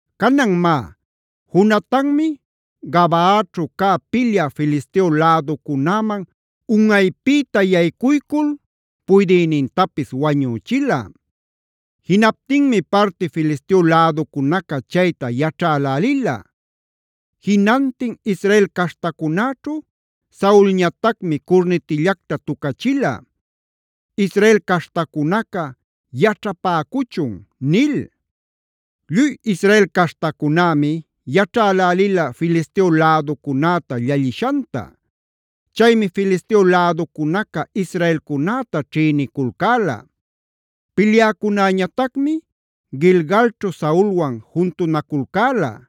Canan má, Jonatanmi Gabaaćhu cä pilyä Filisteo läducunäman unꞌaypïta yaycuycul puydïnintapis wañüchila. Jinaptinmi parti Filisteo läducunaca chayta yaćhälälila. Jinantin Israel caśhtacunäćhu Saulñatacmi curnitillacta tucachila: “Israel caśhtacunaca yaćhapäcuchun” nil. Lluy Israel caśhtacunämi yaćhälälila Filisteo läducunäta llallïshanta. Chaymi Filisteo läducunaca israelcunäta ćhïniculcäla. Pilyäcunäñatacmi Gilgalćhu Saulwan juntunaculcäla.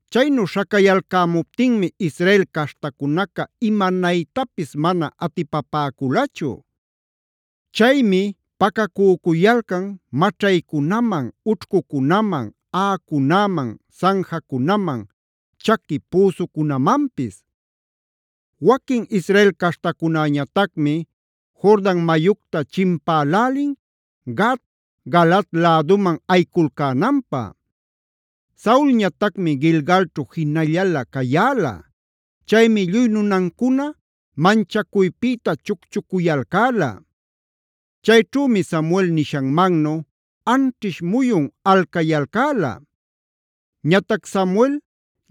Chaynu śhacayalcämuptinmi Israel caśhtacunaca imanaytapis mana atipapäculachu. Chaymi pacacücuyalcan maćhaycunaman, ućhcucunaman, aꞌacunäman, sanjacunaman, chaqui püsucunamanpis. Waquin Israel caśhtacunäñatacmi Jordan mayucta chimpälälin Gad, Galaad läduman ayiculcänanpä. Saulñatacmi Gilgalćhu jinallala cayäla. Chaymi lluy nunancuna manchacuypïta chucchucuyalcäla. Chayćhümi Samuel nishanmannu anćhish muyun alcayalcäla.a Ñatac Samuel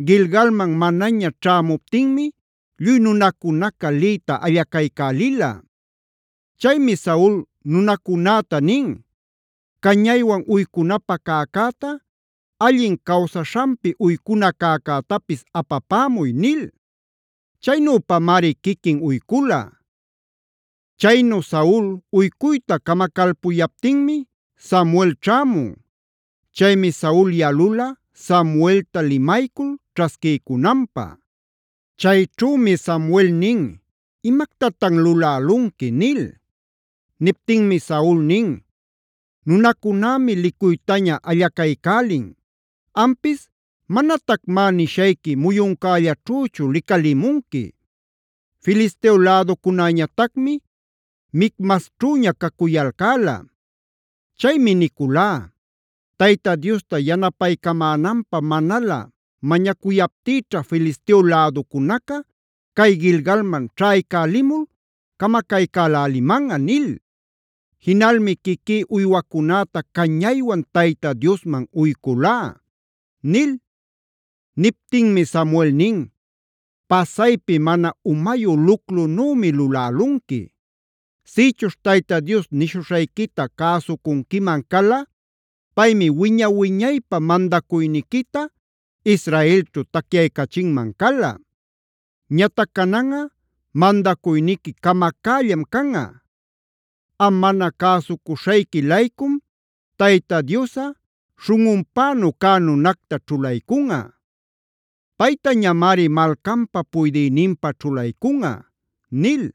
Gilgalman manaña ćhämuptinmi lluy nunacunaca liyta allacaycälila. Chaymi Saul nunacunäta nin: “Cañaywan uycunapä cäcäta, allin cawsaśhanpi uycuna cäcätapis apapämuy” nil. Chaynüpamari quiquin uycula. Chaynu Saul uycuyta camacalpuyaptinmi Samuel ćhämun. Chaymi Saul yalula Samuelta limaycul ćhasquiycunanpä. Chayćhümi Samuel nin: “¿Imactatan lulälunqui?” nil. Niptinmi Saul nin: “Nunacunämi licuytaña allacaycälin. Ampis manatacmá nishayqui muyuncällaćhüchu licalimunqui. Filisteo läducunäñatacmi Micmasćhüña cacuyalcäla. Chaymi niculá: ‘Tayta Diosta yanapaycamänanpä manalä mañacuyaptïćha Filisteo läducunaca cay Gilgalman ćhaycälimul camacaycälimanꞌa’ nil. Jinalmi quiquí uywacunäta cañaywan Tayta Diosman uyculá” nil. Niptinmi Samuel nin: “Pasaypi mana umayu luclunümi lulälunqui. Sïchuśh Tayta Dios nishuśhayquita cäsucunquiman cala, paymi wiña-wiñaypä mandacuyniquita Israelćhu tacyaycachinman cala. Ñatac cananꞌa mandacuyniqui camacällam canꞌa. Am mana cäsucuśhayqui-laycum Tayta Diosꞌa śhunꞌunpänu cä nunacta ćhulaycunꞌa.b Paytañamari malcanpä puydïninpa ćhulaycunꞌa” nil.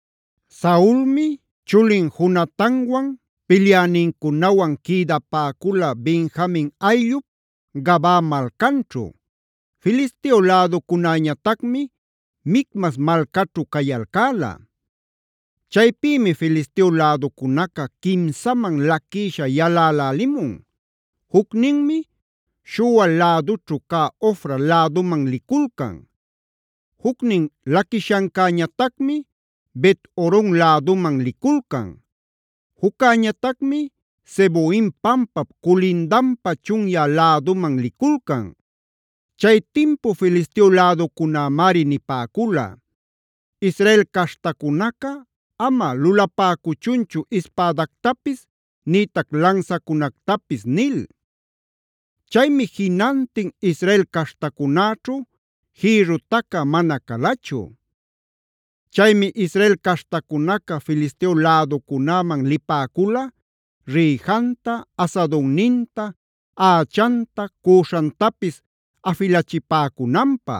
Saulmi chulin Jonatanwan, pilyänincunawan quïdapäcula Benjamin ayllup Gabaa malcanćhu. Filisteo läducunäñatacmi Micmas malcaćhu cayalcäla. Chaypïmi Filisteo läducunaca quimsaman laquïsha yalälälimun. Jucninmi Shual lädućhu ca Ofra läduman liculcan. Jucnin laquishancäñatacmi Bet-horon läduman liculcan; juccäñatacmi Zeboim pampap culindanpa chunyä läduman liculcan. Chay timpu Filisteo läducunämari nipäcula: “Israel caśhtacunaca ama lulapäcuchunchu ispädactapis nïtac lansacunactapis” nil. Chaymi jinantin Israel caśhtacunäćhu jïrru tacä mana calachu. Chaymi Israel caśhtacunaca Filisteo läducunäman lipäcula rïjanta, asadunninta, ächanta, cüśhantapis afilachipäcunanpä.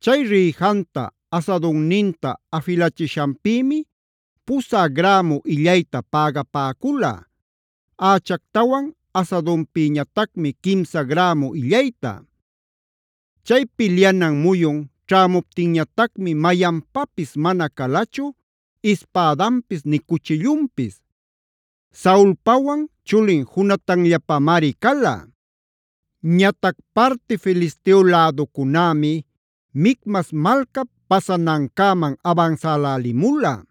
Chay rïjanta, asadunninta afilachishanpïmi pusä grämu illayta pägapäcula, ächactawan asadunpïñatacmi quimsa grämu illayta. Chay pilyanan muyun ćhämuptinñatacmi mayanpapis mana calachu ispädanpis nï cuchillunpis. Saulpawan chulin Jonatanllapamari cala. Ñatac parti Filisteo läducunämi Micmas malcap pasanancäman abansälälimula.